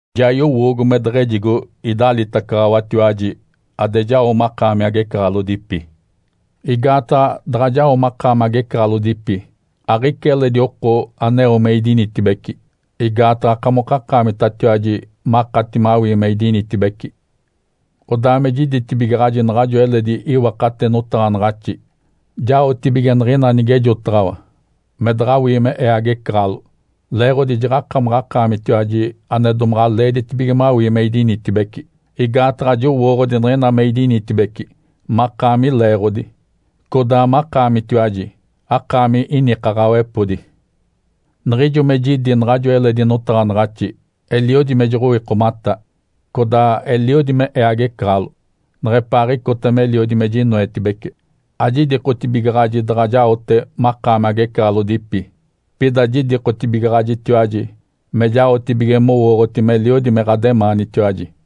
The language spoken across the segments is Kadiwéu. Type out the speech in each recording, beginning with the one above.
Ja yowoogo me deɡ̶ejigo idalitacaɡ̶awatiwaji ade jao makaami agecaɡ̶alodipi. Igaataɡ̶a daɡ̶a jao makaami agecaɡ̶alodipi, aɡ̶ica eledi oko aneo me idinitibeci, igaataɡ̶a akamokakaamitatiwaji makati mawii me idinitibeci. Odaa me jiditibigaɡ̶aji naɡ̶ajo eledi iwakate notaɡ̶anaɡ̶axi jaotibige niɡ̶ina nigejotaɡ̶awa me daɡ̶awii me ee agecaɡ̶alo, leeɡ̶odi jaɡ̶akamaɡ̶akaamitiwaji ane domaɡ̶a leeditibige mawii me idinitibeci. Igaataɡ̶a jowooɡ̶odi niɡ̶ina me idinitibeci makaami leeɡ̶odi, codaa makaamitiwaji akaami inikaɡ̶awepodi. Niɡ̶ijo me jidi naɡ̶ajo eledi notaɡ̶anaɡ̶axi, eliodi me joɡ̶owikomata codaa eliodi me ee agecaɡ̶alo neɡ̶epaaɡ̶icota meliodi me jinoetibece. Ajidikotibigaɡ̶aji daɡ̶a jaote makaami agecaɡ̶alodipi, pida jidikotibigaɡ̶ajitiwaji me jaotibige mowooɡ̶oti meliodi me ɡ̶ademaanitiwaji.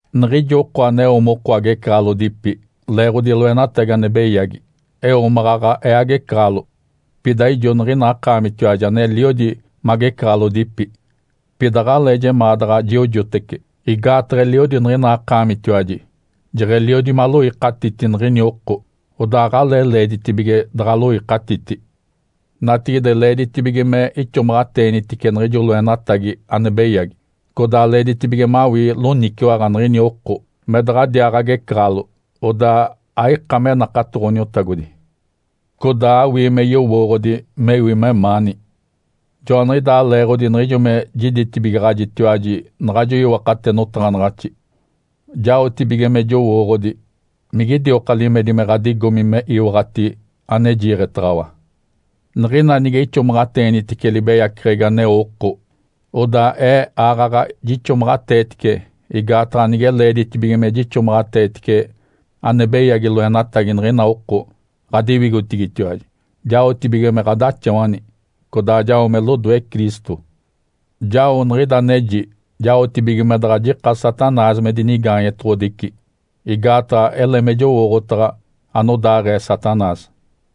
Niɡ̶ijo oko aneo moko agecaɡ̶alodipi leeɡ̶odi loenatagi ane beyagi, eo maɡ̶aɡ̶a ee agecaɡ̶alo, pida ijo niɡ̶ina akaamitiwaji aneliodi magecaɡ̶alodipi. Pida aɡ̶alee jemaa daɡ̶a jiojotece, igaataɡ̶a eliodi niɡ̶ina akaamitiwaji jeɡ̶eliodi maloikatiti niɡ̶ini oko, odaa aɡ̶alee leeditibige daɡ̶aloikatiti. Natigide leeditibige me ixomaɡ̶ateenitice niɡ̶ijo loenatagi ane beyagi. Codaa leeditibige mawii loniciwaɡ̶a niɡ̶ini oko me daɡ̶adiaa agecaɡ̶alo, odaa aika me nakato Ǥoniotagodi. Codaa awii me yowooɡ̶odi mewi memaani. Joaniɡ̶idaa leeɡ̶odi niɡ̶ijo me jiditibigaɡ̶ajitiwaji naɡ̶ajo iwakate notaɡ̶anaɡ̶axi, jaotibige me jowooɡ̶odi migidioka limedi me ɡ̶adigomi me iwaɡ̶ati ane jiiɡ̶etaɡ̶awa. Niɡ̶ina nige ixomaɡ̶ateenitice libeyaceɡ̶egi aneo oko, odaa ee aaɡ̶aɡ̶a jixomaɡ̶ateetice, igaataɡ̶a nige leeditibige me jixomaɡ̶ateetice ane beyagi loenatagi niɡ̶ina oko ɡ̶adiwigotigitiwaji, jaotibige me ɡ̶adaxawani, codaa jao me lodoe Cristo. Jao niɡ̶ida aneji jaotibige me daɡ̶a jika Satanás me dinigaanyetoɡ̶odici, igaataɡ̶a ele me jowooɡ̶otaɡ̶a anodaaɡ̶ee Satanás.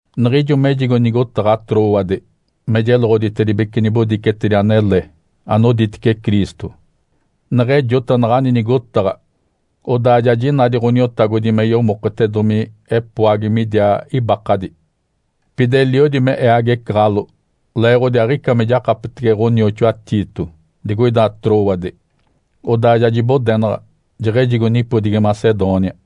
Niɡ̶ijo mejigo nigotaɡ̶a Trôade me jeloɡ̶oditedibece nibodicetedi anele anoditece Cristo. Neɡ̶ejota naɡ̶ani nigotaɡ̶a, odaa ja jinadi Ǥoniotagodi me yomoketedomi epoagi midiaa ibakadi. Pida eliodi me ee agecaɡ̶alo leeɡ̶odi aɡ̶ica me jakapetege ɡ̶onioxoa Tito digoida Trôade. Odaa ja jibodenaɡ̶a, jeɡ̶ejigo nipodigi Macedônia.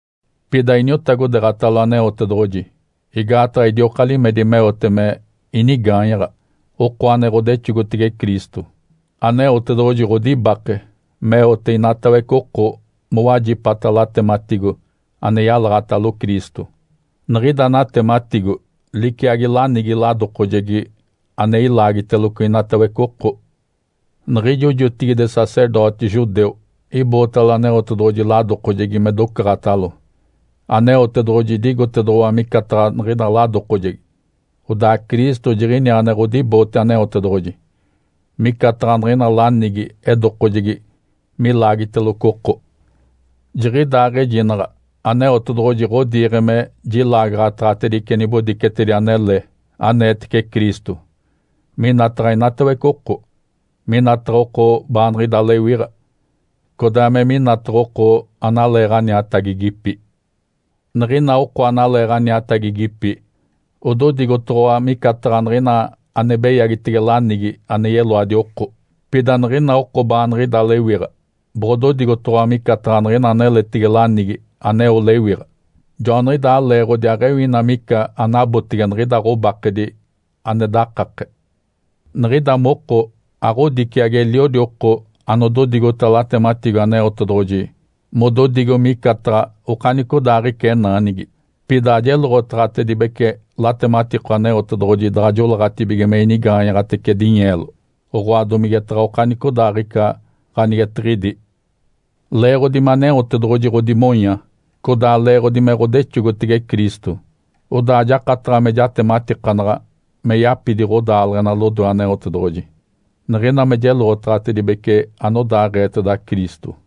Pida iniotagodeeɡ̶atalo Aneotedoɡ̶oji. Igaataɡ̶a idioka limedi meote me inigaanyaɡ̶a, oko ane ɡ̶odexogotege Cristo. Aneotedoɡ̶oji ɡ̶odibake meote inatawece oko mowajipata latematigo ane yalaɡ̶atalo Cristo. Niɡ̶ida natematigo liciagi lanigi ladokojegi ane ilaagiteloco inatawece oko. Niɡ̶ijo jotigide sacerdoti judeu ibootalo Aneotedoɡ̶oji ladokojegi me docaɡ̶atalo. Aneotedoɡ̶oji idigotedoɡ̶owa micataɡ̶a niɡ̶ida ladokojegi. Odaa Cristo jiɡ̶iniaa ane ɡ̶odiboote Aneotedoɡ̶oji. Micataɡ̶a niɡ̶ina lanigi edokojegi milaagiteloco oko, jiɡ̶idaaɡ̶ejinaɡ̶a Aneotedoɡ̶oji ɡ̶odiiɡ̶e me jilaagaɡ̶ataɡ̶atedice nibodicetedi anele aneetece Cristo minataɡ̶a inatawece oko, minataɡ̶a oko baaniɡ̶ida lewiɡ̶a, codaa me minataɡ̶a oko analeeɡ̶aniatagigipi. Niɡ̶ina oko analeeɡ̶aniatagigipi ododigotoɡ̶owa micataɡ̶a niɡ̶ina ane beyagitege lanigi ane yeloadi oko. Pida niɡ̶ina oko baaniɡ̶ida lewiɡ̶a boɡ̶ododigotoɡ̶owa micataɡ̶a niɡ̶ina aneletege lanigi aneo lewiɡ̶a. Joaniɡ̶idaa leeɡ̶odi aɡ̶ewi ina mica anabotege niɡ̶ida ɡ̶obakedi ane dakake. Niɡ̶ida moko aɡ̶odiciagi eliodi oko anodigota latematigo Aneotedoɡ̶oji mododigo micataɡ̶a okanicodaaɡ̶ica enaanigi. Pida ajeloɡ̶otaɡ̶atibece latematigo Aneotedoɡ̶oji daɡ̶a joleeɡ̶atibige me inigaanyaɡ̶atece dinyeelo, oɡ̶oa domigetaɡ̶a okanicodaaɡ̶ica ganigetiɡ̶idi. Leeɡ̶odi me Aneotedoɡ̶oji ɡ̶odimonya, codaa leeɡ̶odi me ɡ̶odexogotege Cristo. Odaa jakataɡ̶a me jatematikanaɡ̶a me yapidi ɡ̶odaaleɡ̶ena lodoe Aneotedoɡ̶oji, niɡ̶ina me jeloɡ̶otaɡ̶atibece anodaaɡ̶eeteda Cristo.